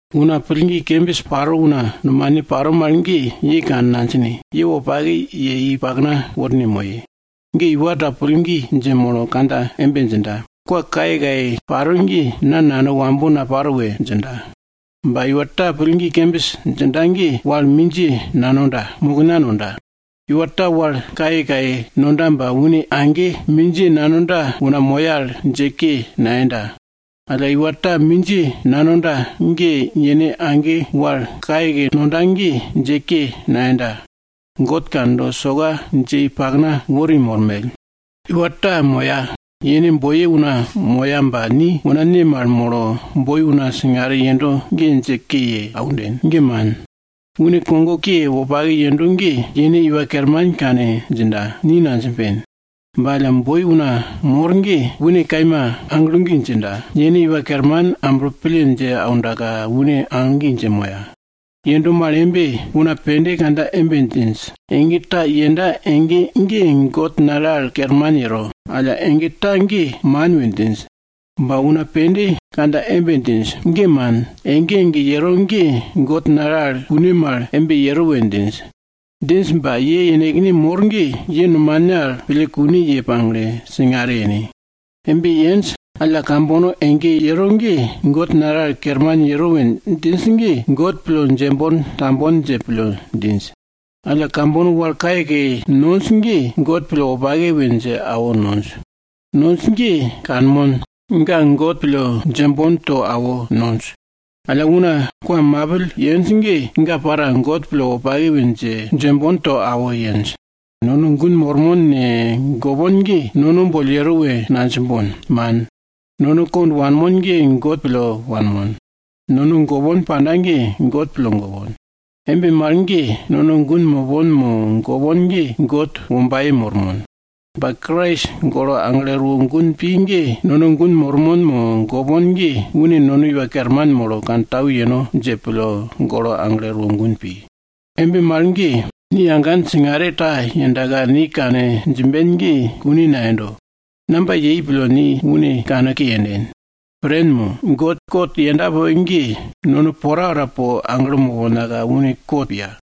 Una pillgi kembis paro una nomane paro mal ge, ye kane nadjine, ye wopake ye i pakna worne moye. Ge iwa ta pillgi dje molo kandja embe djinda, kwa kayekaye paro ge, na nano wambo naparo we djinda. Ba, iwa ta pillgi kembis djinda ge, wal mindjiye nanonda, mokna nonda. Iwa ta wal kayekaye nonda ba une age mindjiye nanonda una moya al dje ke nayenda. Alla iwa ta mindjiye nanonda ge, yene age wal kayekaye nonda ge dje ke nayenda. God kando, soka dje i pakna wori mormell. Iwa ta moya, yene boiye una moya ba, ni una ne mal molo boi una singare yendo ge dje ke ye aunden? Ge man. Une kogo ke wopake yendo ge, yene iwa kerman kane djinda, ni nadjimben. Ba alla boi una moro ge une kaima aglo gi djinda. Yene Iwa Kerman amblo pille dje aundaka, une aglo gi dje moya. Yendo mal embe, una pende kandja embe djinj, ege ta yenda ege ge God nale al kerman yero, alla ege ta ge man we djinj. Ba una pende kandja embe djinj, ge man, ege ege yero ge God nale al kune mal embe yero we djinj. Djinj ba, ye yenekne mor ge, ye nomane al pille kune ye pagle, singare yene. Embe yenj, alla kambono ege yero ge God nale al kerman yero we djinj ge, God pille djembon tambon dje pille djinj. Alla kambono wal kayekaye nonj ge, God pille wopake we dje awo nonj. Nonj ge kanmon, ga God pille djembon to awo nonj. Alla una kwa mapill yenj ge, ga para God pille wopake we dje, djembon to awo yenj. Nono gun mormon ne, gopon ge, nono boll yero we nadjimbon, man. Nono kond wanbon ge God pille wanbon. Nono gopon panda ge, God pille gopon. Embe mal ge, nono gun mopon mo gopon ge God wombaye mopon. Ba Krais golo aglo erwo gun pi ge, nono gun mopon mo gopon ge, une nono Iwa Kerman molo kantau yeno dje pille golo aglo erwo gun pi. Embe mal ge, ni agan singare ta yendaka, ni kane djimben ge kune nayendo. Namba yei pille ni une kanke yenden? Pren mo? God kot yenda poke ge, nono porapora po aglo moponka une kot piya.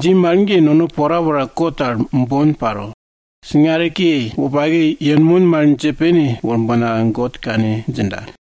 Dji mal ge, nono porapora kot al bon paro, singare ke wopake yenmon mal dje pene worbonka God kane djinda.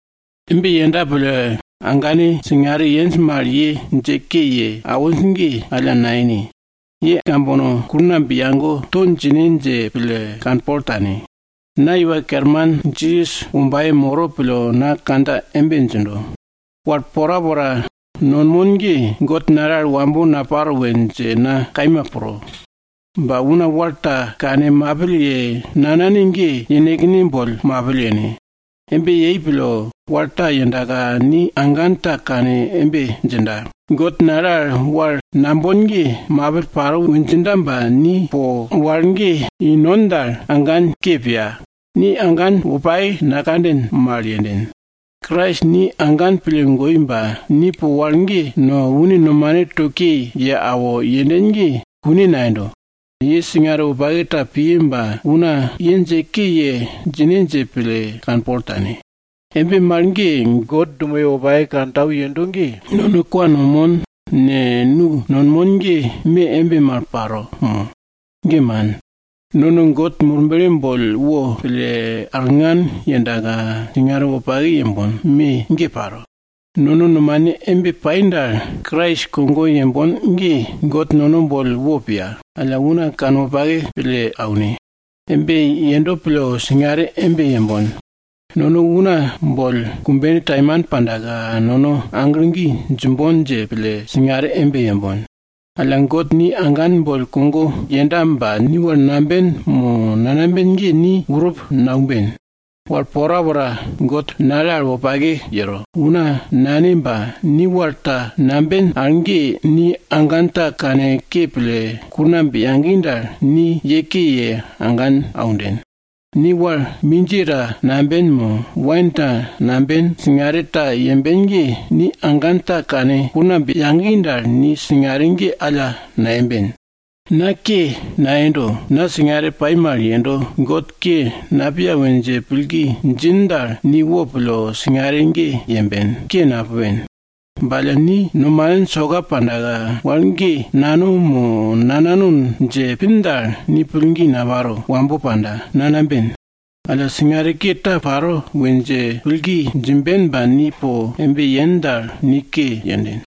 Embe yenda pille, agane ambane pende singare yenj mal, ye dje ke ye awinj ge alla nayene. Kambono ge po kulngamb yage to djine dje pille kanpol tane. Na Iwa Kerman Jisas wombaye moro pille na kandja embe djindo, wal porapora nonmon ge, God nale al wambo naparo we dje na kaima pro. Ba una wal ta kane mapill ye nanane ge, yenekne boll mapill yene. Embe yei pille, wal ta yendaka, ni agan ta kane embe djinda, God nale al wal nambon ge mapill paro we djinda ba, ni po wal ge i non dal, agan ke piya. Ni agan wopake nakanden mal yenden. Krais ni agan pille goi ba, ni po wal ge no, une nomane to ke ye awo yenden ge, kune nayendo. Ye singare wopake ta piye ba una ye dje ke ye djine dje pille, kanpol tane. Embe mal ge, God dumoye wopake kantau yendo al ge nono kwa nonmon ne, nu nonmon ge, me embe mal paro mo? Ge man. Nono God Murble boll wo pille, ellne tukne arngan yendaka, singare wopake yembon, me ge paro. Nono nomane embe pai dal, Krais kogo yembon ge, God nono boll wo piya. Alla una kanwopake pille aune. Embe yendo pille singare embe yembon. Nono una boll kumbene taimane pandaka, nono aglo gi djimbon dje pille, singare embe yembon. Alla God ni agan boll kogo yenda ba ni wal namben, mo nanamben ge ni urup naumben. Wal porapora God nale al wopake yero, una nane ba, ni wal ta namben al ge, ni agan ta kanke pille kulngamb yagi dal, ni ye ke ye agan aunden. Ni wal mindjiye ta namben mo, wain ta namben, singare ta yemben ge, ni agan ta kane kulngamb yagi dal, ni singare ge alla nayemben. Na ke nayendo, na singare pai mal yendo, God ke napiya we dje pillgi djin dal, ni wopille singare ge yemben, ke napupen. Ba alla ni nomanin soka pandaka, wal ge nano mo nanano dje pin dal, ni pillgi naparo, wambo panda, nanamben. Alla singare ke ta paro we dje pillgi djimben ba, ni po embe yen dal, ni ke yenden.